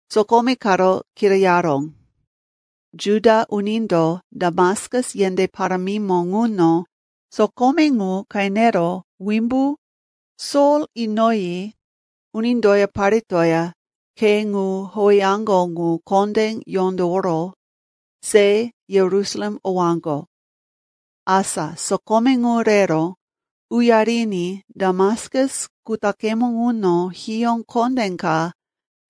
sokome karo kirayaró. Juda unindo Damaskus yendé parámimo ŋuno sokome ŋu qenero wimbu Sol inoyi unindoya paretoya Khe ŋu howeyaŋgo ŋu kondé yondoworo se Yerusalem owaŋgo. Asa sokome ŋu rero uyariní Damaskus kutaqemo ŋuno hiyó kondé ka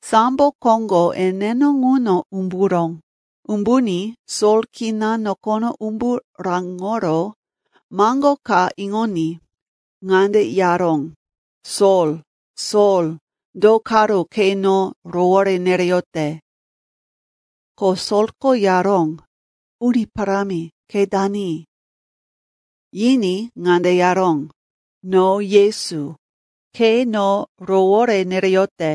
sambo koŋgo eneno ŋuno umburó. Umbuní Sol kina nokono umbu raŋoro maŋgo ka iŋoní ŋande yaró, “Sol, Sol, do karo ke no rowore nereyote?” Ko Solko yaró, “Uni parámi, ke dani?” Yiní ŋande yaró, “No Yesu. Ke no rowore nereyote.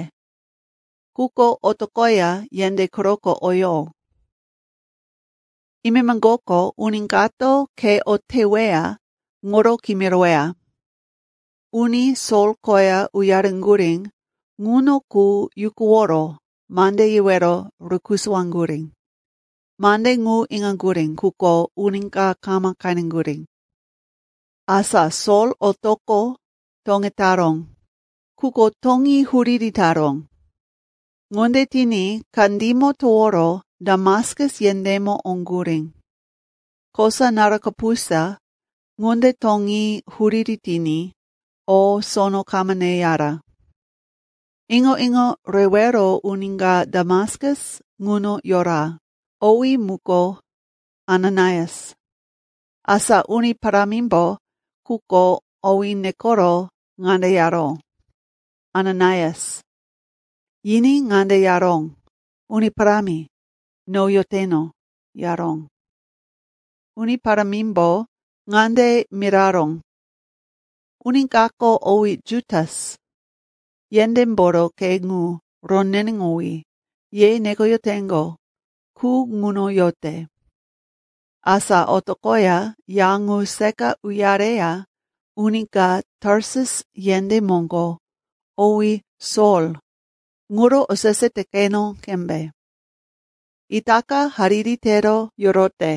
Quko otoqoya yendé quroko oyo. Imemoŋgoko uni kato ke o teweya ŋuro kimiroweya.” Uni Sol koya uyareŋgurí ŋuno qu yukuworo mande yewero rukusuwaŋgurí. Mande ŋu iŋaŋgurí, quko uni ka kama qeneŋgurí. Asa Sol otoqo toŋetaró, quko toŋí huriri taró. Ŋunde tiní kandímo toworo Damaskus yendémo oŋgurí. Kosa naru kapusa ŋunde toŋí huriri tiní o, sono kama neyara. Iŋo-iŋo rewero uni ka Damaskus ŋuno yora, owí muko Ananaias. Asa Uni Parámimbo quko owí nekoro ŋande yaró, “Ananaias.” Yiní ŋande yaró, “Uni Parámi, no yoteno,” yaró. Uni Parámimbo ŋande miraró, “Uni kako owí Jutas, yendémboro khe ŋu, ‘Roneneŋowí,’ ye nekoyoteŋgo qu, ŋuno yote. Asa otoqoya ya ŋu seqa uyareya uni ka Tarsus yendé moŋgo owí Sol ŋuro osese te qeno qembe. Itaka hariri tero yorote.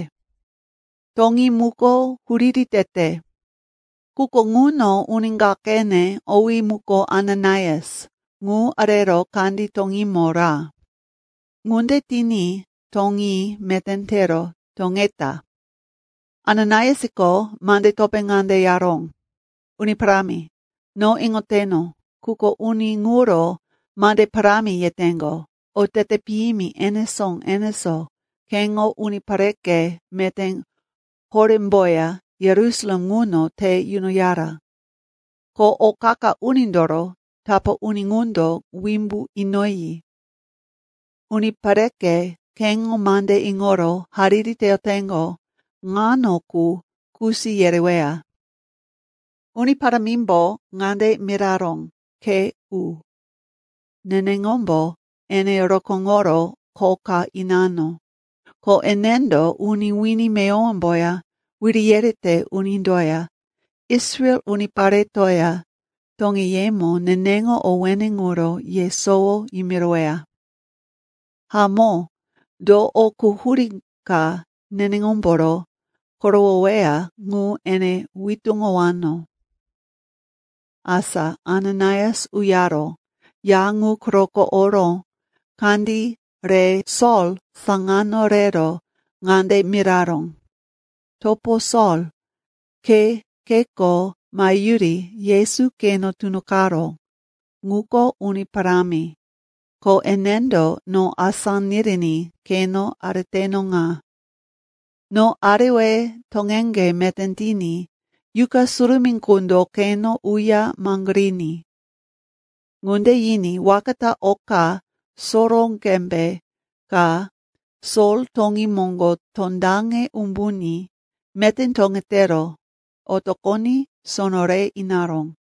Toŋí muko huriri tete. Quko ŋuno uni ka qene, owí muko Ananaias, ŋu arero kandí toŋímo ra. Ŋunde tiní toŋí meté tero toŋeta.” Ananaiasko mande topé ŋande yaró, “Uni Parámi, no iŋoteno, quko uni ŋuro mande parámi yeteŋgo, otete piyimi enesó-enesó keŋo unipareke meté horémboya Yerusalem ŋuno te yunoyara. Ko o qa-qa unindoro tapá uni ŋundo wimbu inoyi, unipareke keŋo mande iŋoro hariri teyoteŋgo ŋano qu kusi yereweya.” Uni Parámimbo ŋande miraró, “Ke u. Neneŋombo ene rokóŋoro kho ka inano, ko enendo uni wini meyowomboya, wiri yerete unindoya, Israel uniparetoya toŋeyemo neneŋo owéne ŋuro yesowo yimiroweya. Hamó, do o quhurí ka neneŋomboro korowoweya ŋu ene witúŋowano.” Asa Ananaias uyaro ya ŋu quroko oro kandí re Sol saŋano rero ŋande miraró, “Topo Sol, ke kheko maheyuri Yesu keno tunoqaró, ŋuko Uni Parámi, ko enendo no asá niriní keno areteno ŋa. No arewe toŋeŋge meté tiní Yuqa Surumí qundo keno uya maŋgoriní.” Ŋunde yiní, waka ta oka soró qembe ka Sol toŋí moŋgo tondaŋe umbuní meté toŋetero otoqoní sono re inaró.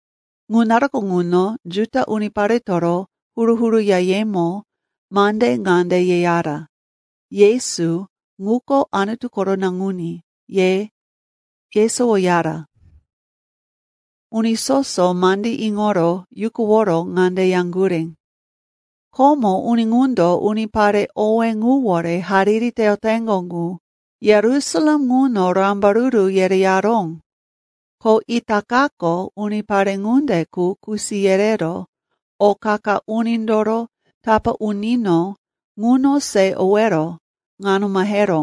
Ŋu naruko ŋuno Juda uniparetoro huru-huru yayemo mande ŋande yeyara, Yesu ŋuko Anutu koro Naŋuní, ye yesowoyara. Uni soso mandí iŋoro yukuworo ŋande yaŋgurí, “Komo uni ŋundo unipare owé ŋuwore hariri teyoteŋgo ŋu Yerusalem ŋuno rambaruru yereyaró, ko itakako unipare ŋunde qu kusi yerero o qa-qa unindoro tapá unino ŋuno se owero ŋano maheró,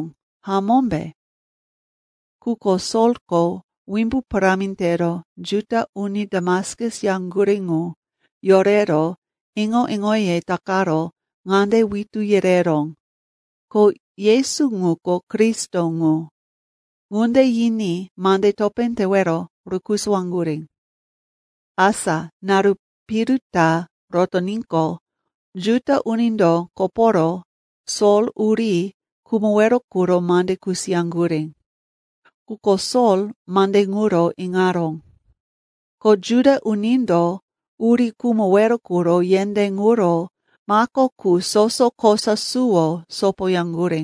hamómbe?” Quko Solko wimbu parámi tero Juda uni Damaskus yaŋgurí ŋu yorero iŋo-iŋoye takaro ŋande witú yereró, ko Yesu ŋuko Kristo ŋu. Ŋunde yiní mande topé tewero rukusuwaŋgurí. Asa naru piru ta rotoníqo, Juda unindo koporo Sol uri khumowero quro mande kusiyaŋgurí. Quko Sol mande ŋuro iŋaró. Ko Juda unindo uri khumowero quro yendé ŋuro mako qu soso kosa suwo sopoyaŋgurí.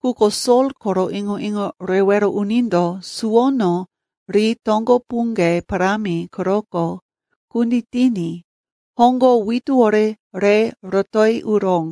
Quko Sol koro iŋo-iŋo rewero unindo suwono ri toŋgo puŋge parámi quroko kunditiní hoŋgo wituwore re rotoyi uró.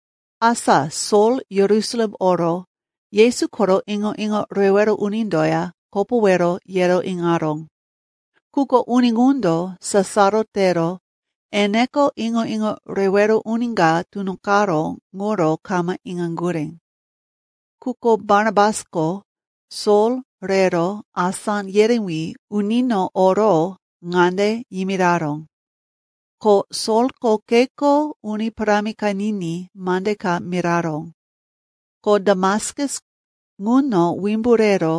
Asa Sol Yerusalem oro Yesu koro iŋo-iŋo rewero unindoya kopowero yero iŋaró. Quko uni ŋundo sasaro tero eneko iŋo-iŋo rewero uni ka tunoqaró ŋuro kama iŋaŋgurí. Quko Barnabasko Sol rero asá yerewí unino oro ŋande yimiraró, ko Solko kheko Uni Parámi qeniní mande ka miraró, ko Damaskus ŋuno wimbu rero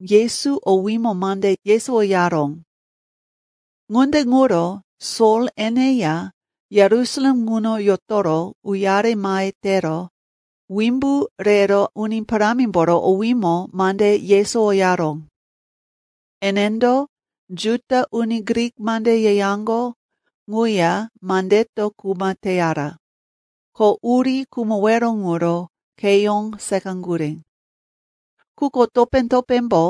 Yesu owímo mande yesowoyaró. Ŋunde ŋuro Sol eneya Yerusalem ŋuno yotoro uyare mahe tero wimbu rero Uni Parámimboro owímo mande yesowoyaró. Enendo Juda uni Grik mande yeyaŋgo ŋuya mandeto kuma teyara. Ko uri khumowero ŋuro kheyó seqaŋgurí. Quko topé-topémbo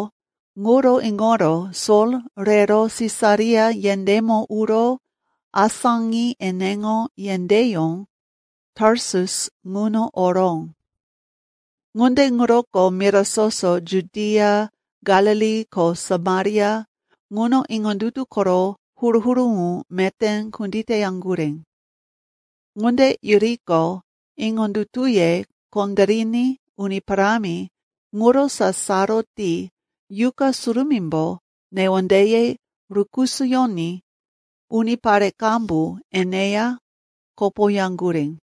ŋuro iŋoro Sol rero Sisaria yendémo uro asáŋi eneŋo yendéyó, Tarsus, ŋuno oró. Ŋunde ŋuroko mira soso Judia, Galili ko Samaria ŋuno iŋondutu koro huru-huru ŋu meté kunditeyaŋgurí. Ŋunde yuriqo, iŋondutuye kondériní Uni Parámi ŋuro sasaro ti Yuqa Surumímbo newondeye rukisoyoní unipare qambu eneya kopoyaŋgurí.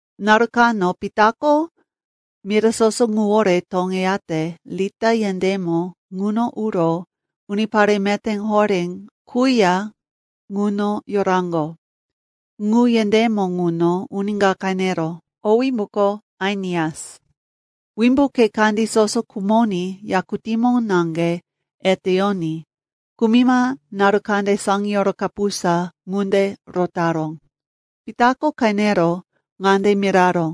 Naru kano Pitako mira soso ŋuwore toŋeyate Lita yendémo ŋuno uro unipare meté horé quya ŋuno yoraŋgo. Ŋu yendémo ŋuno uni ka qeneró, owí muko Ainias. Wimbu khe kandí soso khumoní yakutímo naŋge eteyoní kumima naru kande saŋiyoro kapusa ŋunde rotaró. Pitako qenero ŋande miraró,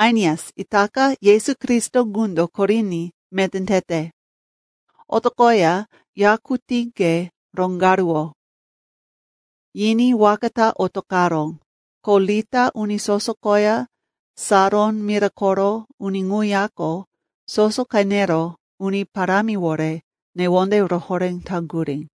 “Ainias, itaka Yesu Kristo ŋundo koriní meté tete. Otoqoya yakutíŋge roŋgaruwo.” Yiní waka ta otoqaró. Ko Lita uni soso koya Saron mira koro uni ŋuyako soso qenero Uni Parámiwore newonde rohoré taŋgurí.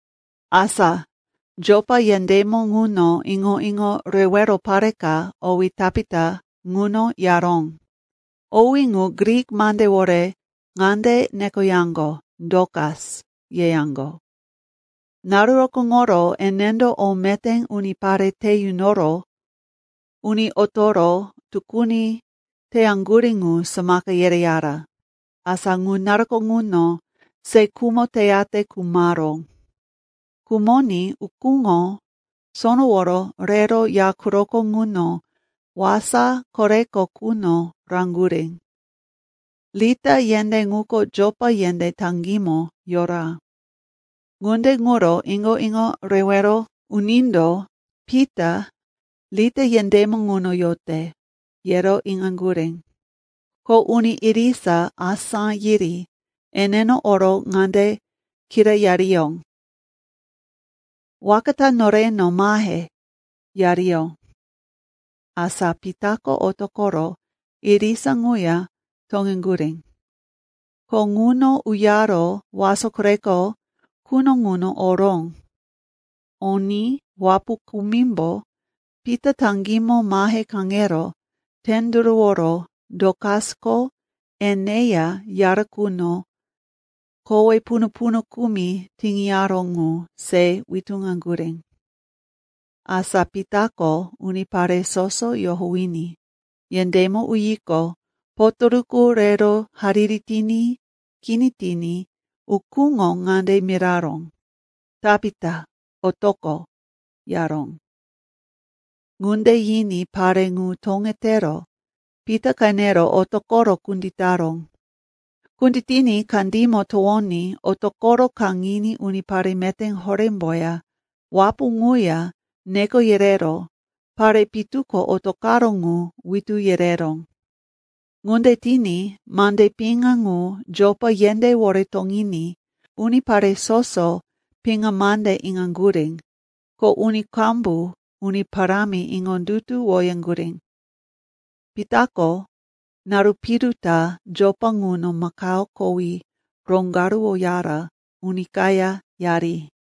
Asa Jopa yendémo ŋuno iŋo-iŋo rewero pare ka owí Tapita ŋuno yaró. Owí ŋu Grik mandewore ŋande nekoyaŋgo, Dokas, yeyaŋgo. Naru rokóŋoro enendo o meté unipare te yunoro uni otoro tukuni teyaŋgurí ŋu samaka yereyara. Asa ŋu naruko ŋuno se khumo teyate khumaró. Khumoní ukúŋo sonoworo rero ya quroko ŋuno wasa koreko quno raŋgurí. Lita yendé ŋuko Jopa yendé taŋgímo yora. Ŋunde ŋuro iŋo-iŋo rewero unindo, Pita Lita yendémo ŋuno yote, yero iŋaŋgurí. Ko uni irisa asá yiri eneno oro ŋande kirayariyó, “Waka ta noreno mahe,” yariyó. Asa Pitako otoqoro irisa ŋuya toŋeŋgurí. Ko ŋuno uyaro wasa koreko quno ŋuno oró. Oní wapu kumimbo Pita taŋgímo mahe kaŋero tenduruworo Dokasko eneya yara quno kowe punu-punu kumi tiŋiyaró ŋu se witúŋaŋgurí. Asa Pitako unipare soso yohowiní yendémo uyiqo, potoruku rero hariri tiní kini tiní ukúŋo ŋande miraró, “Tapita, otoqo,” yaró. Ŋunde yiní pare ŋu toŋetero Pita qenero otoqoro kunditaró. Kunditiní kandímo towoní otoqoro kaŋiní unipare meté horémboya wapu ŋuya neko yerero pare pitu ko otoqaró ŋu witú yereró. Ŋunde tiní mande piŋa ŋu Jopa yendéwore toŋiní unipare soso piŋa mande iŋaŋgurí, ko uni qambu Uni Parámi iŋondutuwoyaŋgurí. Pitako naru piru ta Jopa ŋuno makao kowí roŋgaruwoyara uni kaya yari.